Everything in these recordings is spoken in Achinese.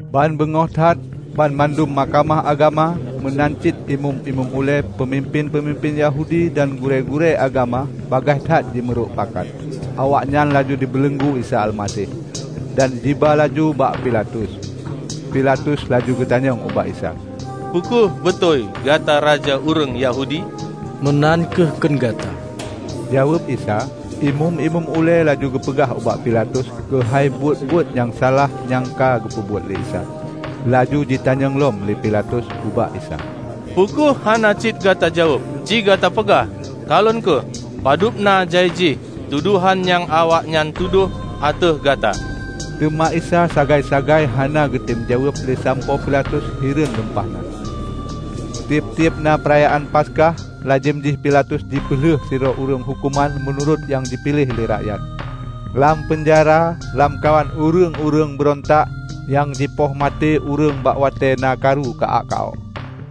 Ban beungoh that, banmandum Mahkamah Agama, meunan cit Imeum-imeum ulée, peumimpén-peumimpén Yahudi dan gurée-gurée agama bagaih that jimeurok pakat. Awaknyan laju jibeuleunggu Isa Almaseh, dan jiba laju ubak Pilatus. Pilatus laju jitanyong ubak Isa, "Peu kheueh beutôi gata raja ureuëng Yahudi?" "Meunan kheueh kheun gata," jaweueb Isa. Imeum-imeum ulée laju jipeugah ubak Pilatus keuhai buet-buet nyang salah nyang ka geupeubuet lé Isa. Laju jitanyong lom lé Pilatus ubak Isa, "Peu kheueh hana cit gata jaweueb, ci gata peugah? Kalon kheueh, padub na jai jih tudohan nyang awaknyan tudoh ateueh Gata!" Teuma Isa sagai-sagai hana geutem jaweueb le sampoe Pilatus hireuen lumpah na. Tieb-tieb na Peurayaan Paskah, lazem jih Pilatus jipeuleueh sidroe ureuëng huköman meunurot nyang jipiléh lé rakyat. Lam peunjara, lamkawan ureuëng-ureuëng beurontak nyang jipoh maté ureuëng bak watée na karu ka-ak ka-ok,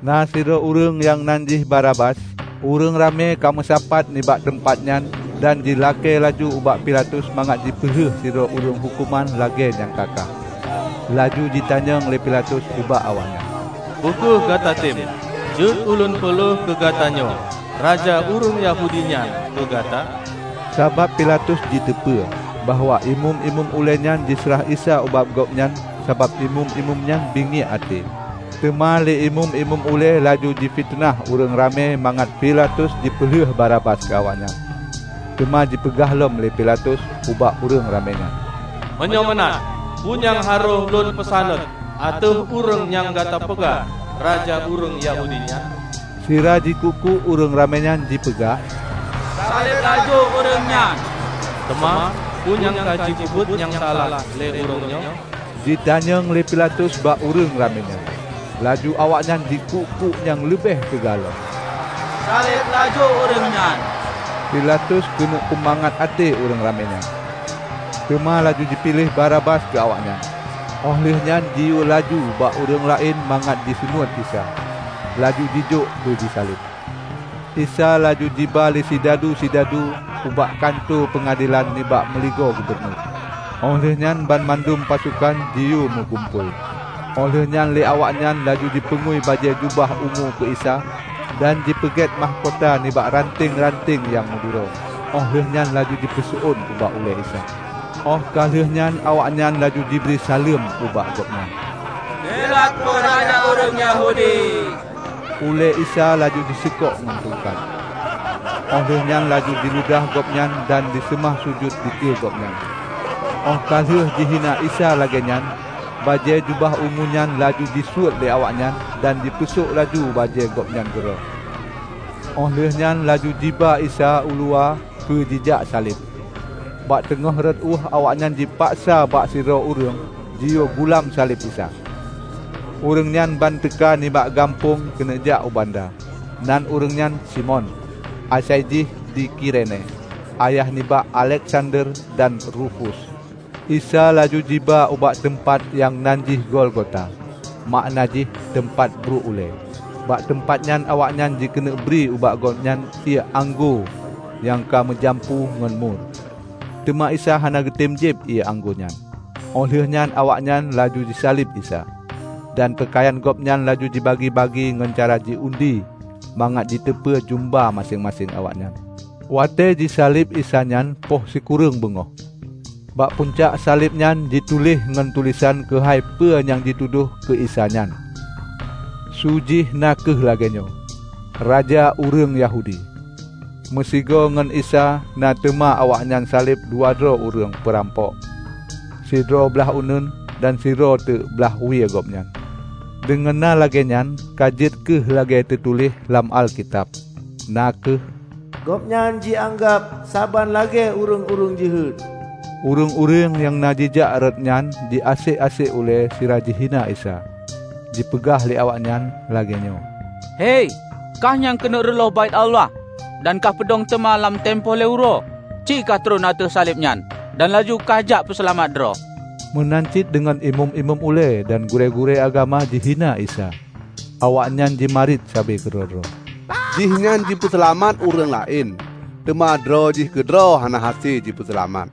na sidroe ureuëng nyang nan jih Barabas. Ureuëng ramé ka meusapat nibak teumpat nyan dan jilakée laju ubak Pilatus mangat jipeuleueh sidroe ureuëng huköman lagée nyang ka-ka. Laju jitanyong lé Pilatus ubak awaknyan, "Peu kheueh gata tem, jeuet ulôn peuleueh keu gatanyoe raja ureuëng Yahudi nyan keu gata?" Sabab Pilatus jiteupeu bahwa Imeum-imeum ulée nyan jiseurah Isa ubak gobnyan sabab Imeum-imeum nyan bingiek até. Teuma lé Imeum-imeum ulée laju jipiteunah ureuëng ramé mangat Pilatus jipeuleueh Barabas keu awaknyan. Teuma jipeugah lom lé Pilatus ubak ureuëng ramé nyan, "Meunyoe meunan, peue nyang harôh lôn peusaneut ateueh ureuëng nyang gata peugah raja ureuëng Yahudi nyan?" Sira jikuk-kuk ureuëng ramé nyan jipeugah, "Saleb laju ureuëng nyan!" "Teuma peue nyang ka jipeubuet nyang salah lé Ureuëng nyoe?" jitanyong lé Pilatus bak ureuëng ramé nyan. Laju awaknyan jikuk-kuk nyang leubeh teuga lom, "Saleb laju ureuëng nyan!" Pilatus keuneuk peumangat até ureuëng ramé nyan, teuma laju jipeuleueh Barabas keu awaknyan. Óh lheueh nyan jiyue laju bak ureuëng laén mangat jiseunuét Isa, laju jijok keu jisaleb. Isa laju jiba lé sidadu-sidadu ubak kantô peungadelan nibak meuligoe gubunur. Óh lheueh nyan banmandum pasokan jiyue meugumpôi. Óh lheueh nyan lé awak nyan laju jipeungui bajée jubah ungu keu Isa, dan jipeugét mahkota nibak ranteng-ranteng nyang meuduro, óh lheueh nyan laju jipeuseuôn bak ulée Isa. Óh ka lheueh nyan awaknyan laju jibri saleuem ubak Gobnyan, "Delat Po Raja ureuëng Yahudi!" Ulée Isa laju jiseukok ngon tungkat, óh lheueh nyan laju jiludah Gobnyan dan jiseumah sujut dikeue Gobnyan. Óh ka lheueh jihina Isa lagée nyan, bajée jubah ungu nyan laju jisuet lé awaknyan dan jipeusok laju bajée Gobnyan keudroe. Óh lheueh nyan laju jiba Isa uluwa keu jijak saleb. Bak teungoh rot ueh awaknyan jipaksa bak sidroe ureuëng jiyue gulam saleb Isa. Ureuëng nyan ban teuka nibak gampông keuneuk jak u banda. (Nan ureuëng nyan Simon, -- asai jih di Kirene -- ayah nibak Alexander dan Rufus.) Isa laju jiba ubak teumpat nyang nan jih Golgota, makna jih, "Teumpat bruek ulée". Bak teumpat nyan awaknyan jikeuneuk bri ubak Gobnyan ié anggô nyang ka meujampu ngon mur, teuma Isa hana geutem jieb ié anggô nyan. Óh lheueh nyan awaknyan laju jisaleb Isa, dan peukayan Gobnyan laju jibagi-bagi ngon cara ji-undi mangat teuteupeu jeumba maséng-maséng awaknyan. Watée ji saleb Isa nyan poh sikureueng beungoh. Bak pucak saleb nyan jituléh ngon tulésan keuhai peu nyang jitudôh keu Isa nyan, su jih na kheueh lagée nyoe: "Raja Ureuëng Yahudi". Meusigoe ngon Isa na teuma awaknyan saleb dua droe ureuëng peurampok; sidroe blaih uneuen dan sidroe teuk blaih wie Gobnyan. Deungon na lagée nyan ka jeuet kheueh lagée na teutuléh lam Alkitab; na kheueh: "Gobnyan jianggab saban lagée ureuëng-ureuëng jeuhet." Ureuëng-ureuëng nyang na jijak rot nyan jiasek-asek ulée sira jihina Isa. Jipeugah lé awaknyan lagée nyoe, "Hei, kah nyang keuneuk reuloh Baét Allah dan kahpeudong teuma lam timpo lhée uroe. Ci kah tron ateueh saleb nyan dan laju kahjak peuseulamat droe!" Meunan cit deungon imeum-imeum ulée dan gurée-gurée agama jihina Isa. Awaknyan jimarit sabe keudroe-droe, "Jihnyan jipeuseulamat ureuëng laén, teuma droe jih keudroe hana hase jipeuseulamat!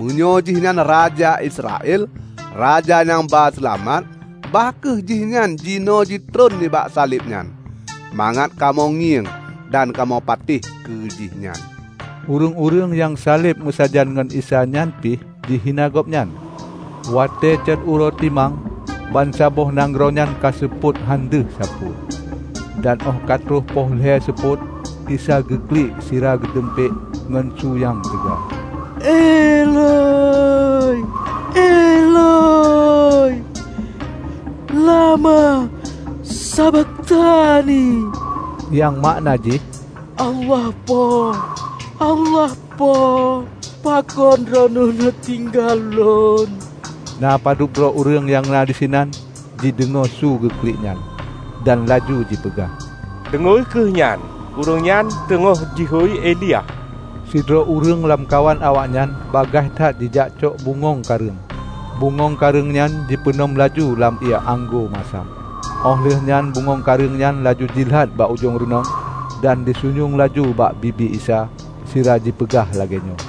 Meunyoe jihnyan raja Israel, Raja nyang ba Seulamat, bah kheueh jihnyan jinoe jitron nibak saleb nyan, mangat kamoe ngieng dan kamoe patéh keu jihnyan!" Ureuëng-ureuëng nyang saleb meusajan ngon Isa nyan pih jihina Gobnyan. Watée cot uroe timang, bansaboh nanggroe nyan ka seupôt hán deuh sapeue. Dan óh ka troh poh lhée seupôt, Isa geuklik sira geudumpék ngon su nyang teuga, "Eloi, Eloi, lama sabakhtani?" Nyang makna jih, "Allah Po, Allah Po, pakon Droeneueh neutinggai Lôn?" Na padub droe ureuëng nyang na disinan jideungoe su geuklik nyan, dan laju jipeugah, "Deungoe kheueh nyan, Ureuëng nyan teungoh jihôi Elia!" Sidroe ureuëng lam kawan awaknyan bagaih that jijak cok bungöng kareueng, bungöng kareueng nyan jipeunom laju lam ié anggô masam. Óh lheueh nyan bungöng kareueng nyan laju jilat bak ujong reunong, dan jisunyueng laju bak bibi Isa, sira jipeugah lagée nyoe,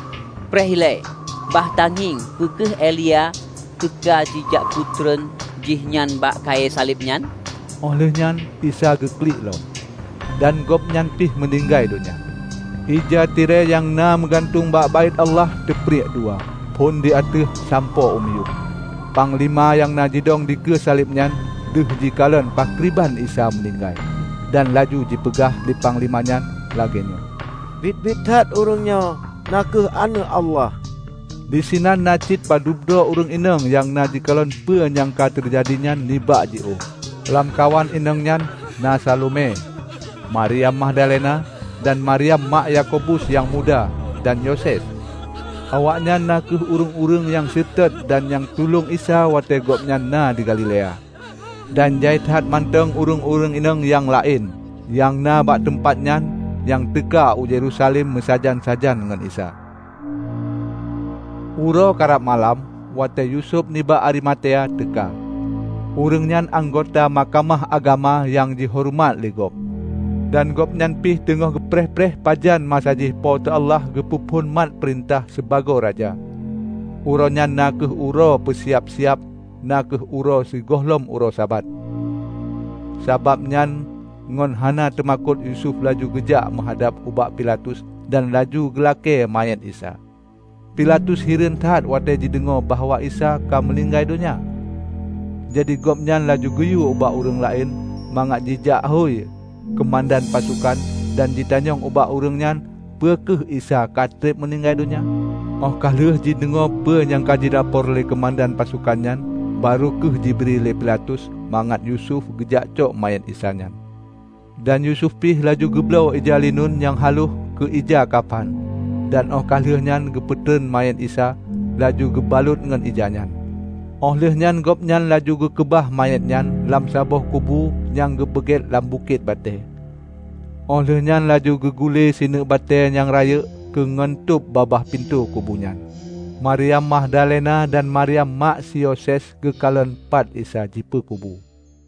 "Preh ilée, bah tangieng peu kheueh Elia teuka jijak peutron Jihnyan bak kayée saleb nyan." Óh lheueh nyan Isa geuklik lom, dan Gobnyan pih meuninggai donya. Ija tirée nyang na meugantung bak Baét Allah teupriek dua phon di ateueh sampoe u miyueb. Panglima nyang na jidong dikeue saleb nyan, deuh jikalon pakriban Isa meuninggai. Dan laju jipeugah lé panglima nyan lagée nyoe, "Biet-biet that ureuëng nyoe na kheueh Aneuëk Allah!" Disinan na cit padub droe ureuëng inong nyang na jikalon peue nyang ka teujadi nyan nibak jiôh. Lamkawan inong nyan na Salome, Maryam Magdalena, dan Maryam mak Yakobus nyang muda dan Yoses. Awaknyan kheueh ureuëng-ureuëng nyang seutôt dan nyang tulông Isa watée Gobnyan na di Galilea. Dan jai that mantong ureuëng-ureuëng inong nyang laén nyang na bak teumpat nyan nyang ka teuka u Yerusalem meusajan-sajan ngon Isa. Uroe karab malam watée Yusuf nibak Arimatea teuka. Ureuëng nyan anggota Mahkamah Agama nyang jihoreumat le gob. Dan Gobnyan pih teungoh geupreh-preh pajan masa jih Po teu Allah geupeu phon mat peurintah sibagoe Raja. Uroe nyan na kheueh uroe peusiab-siab (na kheueh uroe sigohlom uroe Sabat) Sabab nyan ngon hana teumakot Yusuf laju geujak meuhadab ubak Pilatus dan laju geulakée manyét Isa. Pilatus hireuen that watée jideungoe bahwa Isa ka meuninggai donya. Jadi gobnyan laju geuyue ubak ureuëng laén mangat jijak hôi keumandan pasokan dan jitanyong ubak ureuëng nyan peu kheueh Isa ka treb meuninggai donya. Óh ka lheueh jideungoe peue nyang ka jilapor lé keumandan pasokan nyan, barô kheueh jibri lé Pilatus mangat Yusuf geujakcok manyét Isa nyan. Dan Yusuf pih laju geubloe ija lineun nyang haloh keu ija kapan dan óh ka lheueh geupeutron manyét Isa, laju geubalot ngon ija nyan. Óh lheueh nyan gobnyan laju geukeubah manyét nyan lam saboh kubu nyang geupeugét lam bukét batée. Óh lheueh nyan laju geugule sineuk batée nyang rayeuk keu ngon tôb babah pintoe kubu nyan. Maryam Magdalena dan Maryam mak si Yoses geukalon pat Isa jipeukubu.